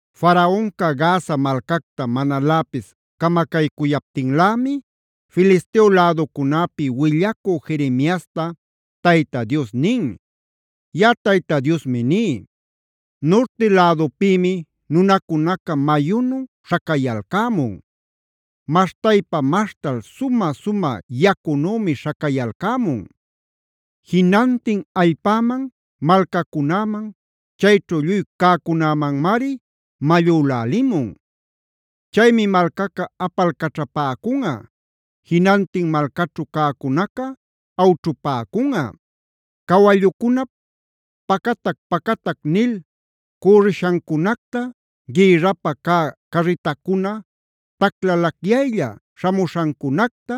Faraonca Gaza malcacta manaläpis camacaycuyaptinlämi Filisteo läducunäpia willacü Jeremiasta Tayta Dios nin: “Yaꞌa Tayta Diosmi ní: Nurti lädupïmi nunacunaca mayunu śhacayalcämun; maśhtaypa-maśhtal sumä-sumä yacunümi śhacayalcämun. Jinantin allpäman, malcacunäman, chayćhu lluy cäcunämanmari mallülälimun. Chaymi malcaca apalcaćhapäcunꞌa; jinantin malcaćhu cäcunaca awćhupäcunꞌa. Cawallucunap ‘pacatac-pacatac’ nil cürrishancunacta, gïrrapä cä carritacuna taclalacyaylla śhamuśhancunacta,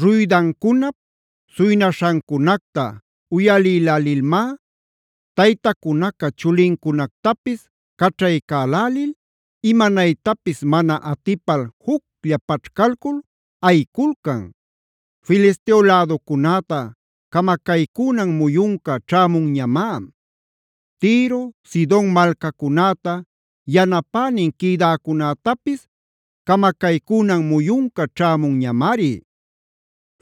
ruydancunap suynaśhancunacta uyalïlälilmá, taytacunaca chulincunactapis caćhaycälil, imanaytapis mana atipal juclla paćhcalcul ayiculcan. “Filisteo läducunäta camacaycünan muyunca ćhämunñamá. Tiro, Sidon malcacunäta yanapänin quïdäcunätapis camacaycünan muyunca ćhämunñamari.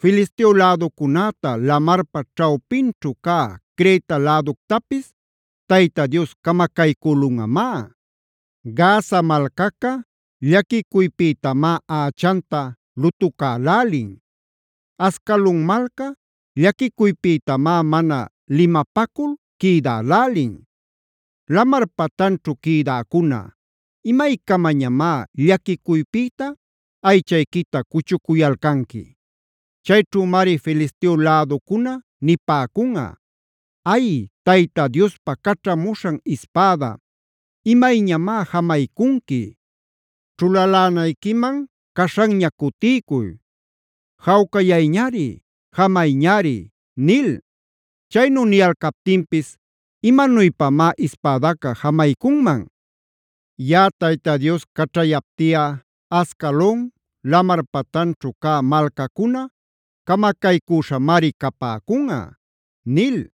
Filisteo läducunäta, lamarpa ćhawpinćhu cä Creta läductapis Tayta Dios camacaycülunꞌamá. Gaza malcaca llaquicuypïtamá ächanta lutucälälin. Ascalon malca llaquicuypïtamá mana limapacul quïdälälin. Lamar patanćhu quïdäcuna,b ¿imaycamañamá llaquicuypïta aychayquita cuchucuyalcanqui? “Chayćhümari Filisteo läducuna nipäcunꞌa: ‘Ay, Tayta Diospa caćhamuśhan ispäda, ¿imayñamá jamaycunqui? Ćhulalänayquiman caśhanña cutiycuy. Jawcayayñari; jamayñari’ nil. “Chaynu niyalcaptinpis ¿imanuypamá ispädaca jamaycunman? Yaꞌa Tayta Dios caćhayaptiꞌa Ascalon, lamar patanćhu cä malcacunaca camacaycüśhamari capäcunꞌa” nil.